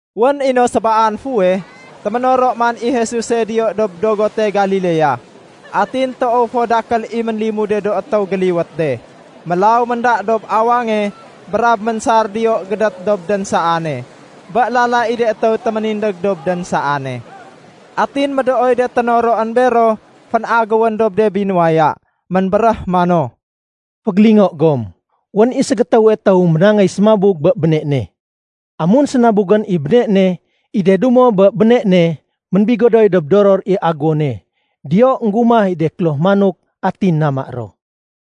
Wén i no sébaan fuweh, téménoro man i Jesuse diyo dob dogote Galilea. Atin toow fo dakél i ménlimude do étéw géliwét de. Mélaw ménda dob awange brab ménsar diyo gédét dob dénsaane, bé lala i de étéw téménindég dob dénsaane. Atin médooy de ténoroén bero fénagéwén dob de binuwaya. Ménbéréh mano, “Fégélingo gom. Wén i ségétéwe étéw ménangéy sémabug bé béne ne. Amun sénabugén i béne ne, i de dumo bé béne ne ménbigodoy dob doror i aguwone. Diyo énggumah i de kloh manok, atin nama ro.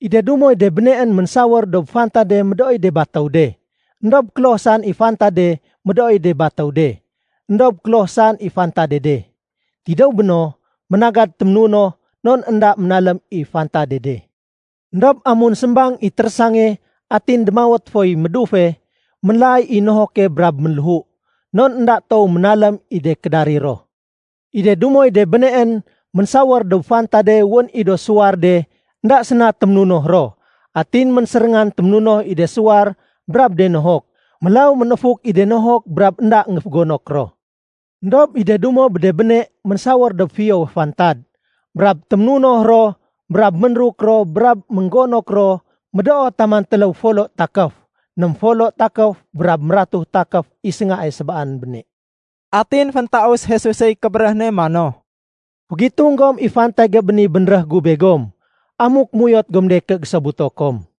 I de dumoy de béneén ménsawér dob fantade médooy de batéw de, éndob kloh saén i fantade médooy de batéw de, éndob kloh saén i fantade de. Tidéw béno, ménagad téménunoh non énda ménalém i fantade de. Endob amun sémbang i térésange, atin démawét foy médufe, ménlaay i nohoke brab ménléhu, non énda toow ménalém i de kédarir ro. I de dumoy de béneén ménsawér dob fantade wén i do suwar de énda séna téménunoh ro. Atin ménséréngan téménunoh i de suwar brab de nohok. Mélaw ménéfuk i de nohok brab énda énggéfogonok ro. Endob i de dumo bé de béne ménsawér dob fiyowe fantad, brab témunoh ro brab ménruk ro brab ménggonok ro médoo taman téléw folo takéf, ném folo takéf brab mératu takéf i séngae sébaan béne.” Atin féntaus Jesusey kébéréh ne mano, “Fégitung gom i fantage bé ni bénréh gu begom amuk méuyot gom de ké gésobuto kom.”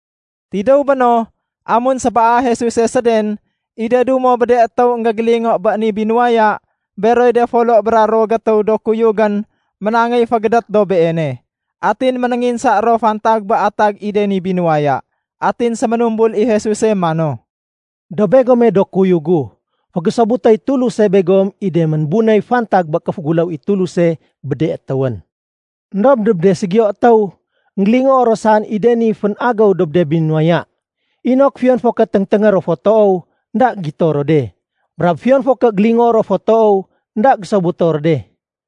Tidéw béno, amun sébaa Jesuse séden, i de dumo bé de étéw énggégélingo bé ni binuwaya, beroy de folo bra ruwo gétéw do kuyugén ménangéy fégédét dob Beene. Atin ménénginsa ro fantag bé atag i de ni binuwaya. Atin séménumbul i Jesuse mano, “Dob begome do kuyug gu, fégésobutéy Tuluse begom i de ménbunéy fantag bé kéféguléw i Tuluse bé de étéwén. Endob dob de ségiyo étéw, énggélingoo ro saén i de ni fén-agéw dob de binuwaya, inok fiyon fo ké téngténgé ro fo toow, énda gito ro de. Brab fiyon fo ké gélingoo ro fo toow, énda gésobuto ro de.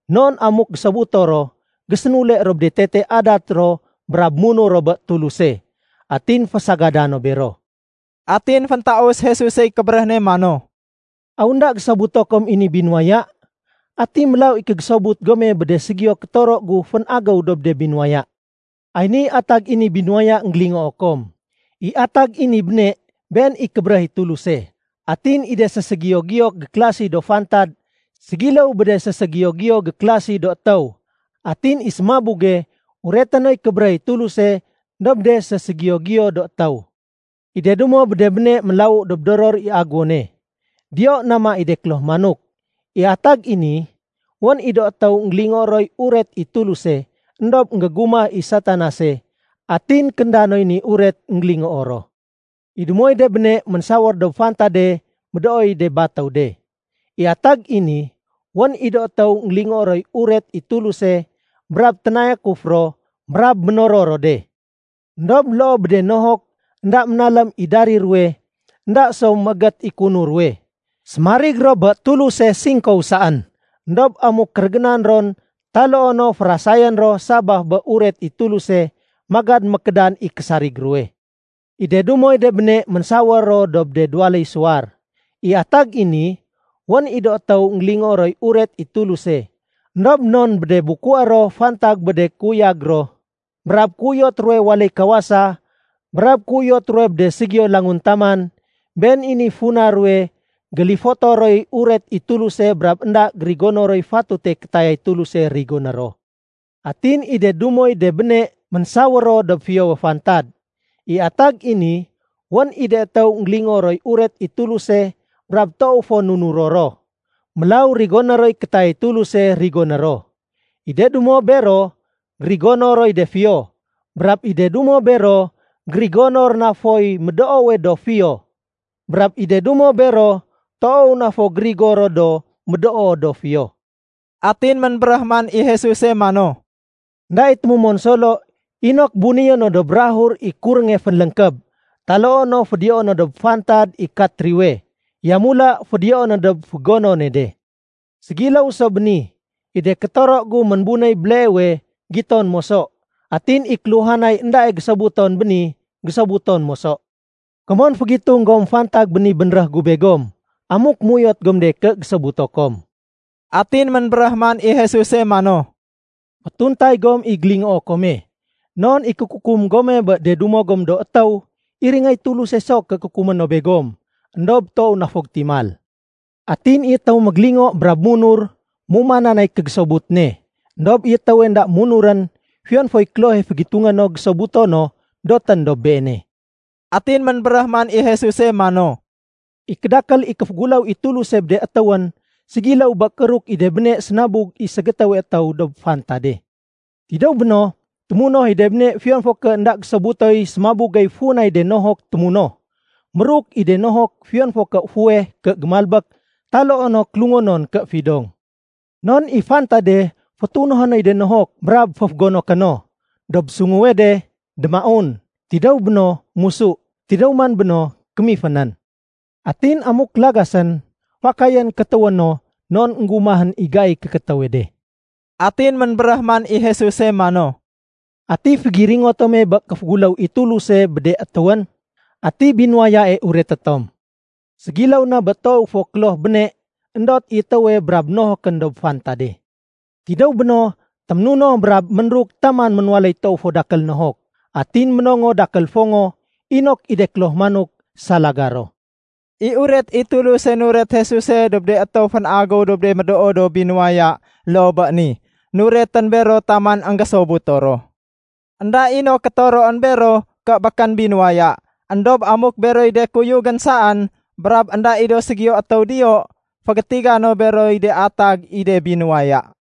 Non amuk gésobuto ro, gésénule ro bé de tete adat ro brab munur ro bé Tuluse, atin fésagada no bero.” Atin féntaus Jesusey kébéréh ne mano, “Aw énda gésobuto kom i ni binuwaya? Ati mélaw i kégésobut gome bé de ségiyo kétoro gu fén-agéw dob de binuwaya? Ay niy atag i ni binuwaya énggélingoo kom. I atag i ni béne, been i kébéréh i Tuluse. Atin i de séségiyo-giyo gékélasi do fantad ségiléw bé de séségiyo-giyo gékélasi do étéw. Atin i sémabuge ureté noy kébéréh i Tuluse dob de séségiyo-giyo do étéw. I de dumo bé de béne ménlawu dob doror i aguwone. Diyo nama i de kloh manok. I atag i ni, wén i do étéw énggélingoo roy uret i Tuluse, éndob énggégumah i Satanase, atin kénda noy ni uret énggélingoo ro. I dumoy de béne ménsawér dob fantade médooy de batéw de. I atag i ni, wén i do étéw énggélingoo roy uret i Tuluse brab ténayakuf ro brab ménoror ro de. Endob loo bé de nohok énda ménalém i darir ruwe, énda so méégét i kéunur ruwe. Sémarig ro bé Tuluse singkow saén. Endob amuk kérégénan ron taloo no férasayén ro sabaf bé uret i Tuluse, magad mékédan i késarig ruwe. I de dumoy de béne ménsawér ro dob de duwaléy suwar. I atag i ni, wén i do étéw énggélingoo roy uret i Tuluse, éndob non bé de bukué ro fantag bé de kéuyag ro, brab kéuyot ruwe waléy kawasa, brab kéuyot ruwe bé de ségiyo do languntaman, been i niy funa ruwe gélifoto roy uret i Tuluse brab énda gérigono roy fatute kétayay Tuluse rigoné ro. Atin i de dumoy de béne ménsawér ro dob fiyowe fantad. I atag i ni, wén i de étéw énggélingoo roy uret i Tuluse brab toow fo nunuro ro. Mélaw rigoné roy kétayay Tuluse rigoné ro. I de dumo bero gérigono roy de fiyo, brab i de dumo bero gérigono ro na foy médoowe do fiyo, brab i de dumo bero toow na fo gérigo ro do médoo do fiyo.” Atin ménbéréh man i Jesuse mano, “Enda i témumon solo inok bunéyé no dob bukag i kurénge fénléngkéb, taloo no fédiyoé no dob fantad i katriwe. Yamula fédiyoé no dob fégonone de. Ségiléw so bé ni, i de kétoro gu ménbunéy béleewe, giton moso. Atin i kéluhanay éndae gésobuton béni, gésobuton moso. Komon fégitung gom fantag bé ni bénréh gu begom amuk méuyot gom de ké gésobuto kom.” Atin ménbéréh man i Jesuse mano, “Fétuntay gom i gélingoo kome. Non i kékukum gome bé de dumo gom do étéw, iringéy Tuluse so ké kukumé no begom, éndob toow na fo gétimal. Atin i étéwe mégélingo brab munur, méumanan nay kégésobut ne. Endob i étéwe énda munurén, fiyon foy klohe fégitungé no gésobuto no, dotén dob beene.” Atin ménbéréh man i Jesuse mano, “I kédakél i kéféguléw i Tuluse bé de étéwén ségiléw bé kééruk i de béne sénabug i ségétéwe étéw dob fantade. Tidéw béno, témunoh i de béne fiyon fo ké énda gésobutoy sémabugey funay de nohok témunoh. Méruk i de nohok fiyon fo ké fuweh ké gémalbék taloo no kélungonon ké fidong. Non i fantade fétunohé noy de nohok brab féfégonoké no. Dob sunguwe de, démaun. Tidéw béno, musu. Tidéw man béno, kémifénén. Atin amuk lagasén, fakayén kétéwé no non énggumahén i gaiy kékétéwe de.” Atin ménbéréh man i Jesuse mano, “Ati fégiringo tom bé kéféguléw i Tuluse bé de étéwén? Ati binuwayae ureté tom? Ségiléw na bé toowe fo kloh béne, éndot i étéwe brab nohokén dob fantade. Tidéw béno, téménunoh brab ménruk taman ménwaléy toow fo dakél nohok. Atin ménongo dakél fongo, inok i de kloh manok salaga ro.” I uret i Tuluse nuret Jesuse dob de étéw fén-agéw dob de médoo do binuwaya loo bé ni. Nuretén bero taman énggésobuto ro. Enda i no kétoroén bero ké békén binuwaya. Endob amuk beroy de kuyugén saén brab énda i do ségiyo étéw diyo, fégétiga no beroy de atag i de binuwaya.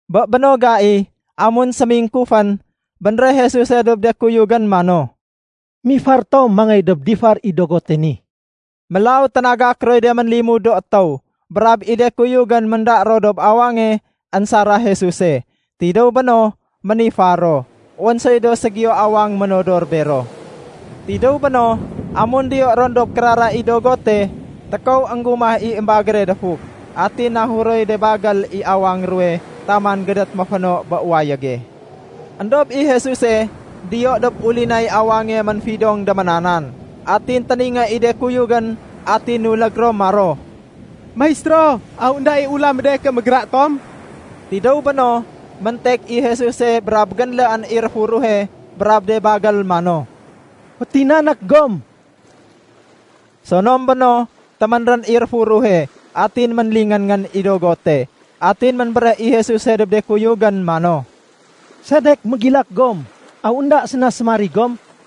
Bé béno gai, amun sémingkufén, bénréh Jesuse dob de kuyugén mano, “Mifar tom mangéy dob difar i dogote ni.” Mélaw ténagak roy de ménlimud do étéw, brab i de kuyugén ménda ro dob awange énsara Jesuse. Tidéw béno, ménifar ro. Wén soy do ségiyo awang ménodor bero. Tidéw béno, amun diyo ron dob kérara i dogote, tékow énggumah i émbagére défuk. Atin nahuroy de bagél i awang ruwe taman gédét ménféno bé wayége. Endob i Jesuse diyo dob ulinay awange, ménfidong déménanan. Atin téningé i de kuyugén atin nulég ro maro, “Maistéro, aw énda i ula mé de ké mégra tom?” Tidéw béno, méntek i Jesuse brab génléén i réfuruhe brab de bagél mano, “Fétinanék gom!” Sonom béno, téménrén i réfuruhe, atin ménlingén-ngén i dogote. Atin ménbéréh i Jesuse dob de kuyugén mano, “Sedek mégilak gom? Aw énda séna sémarig gom?”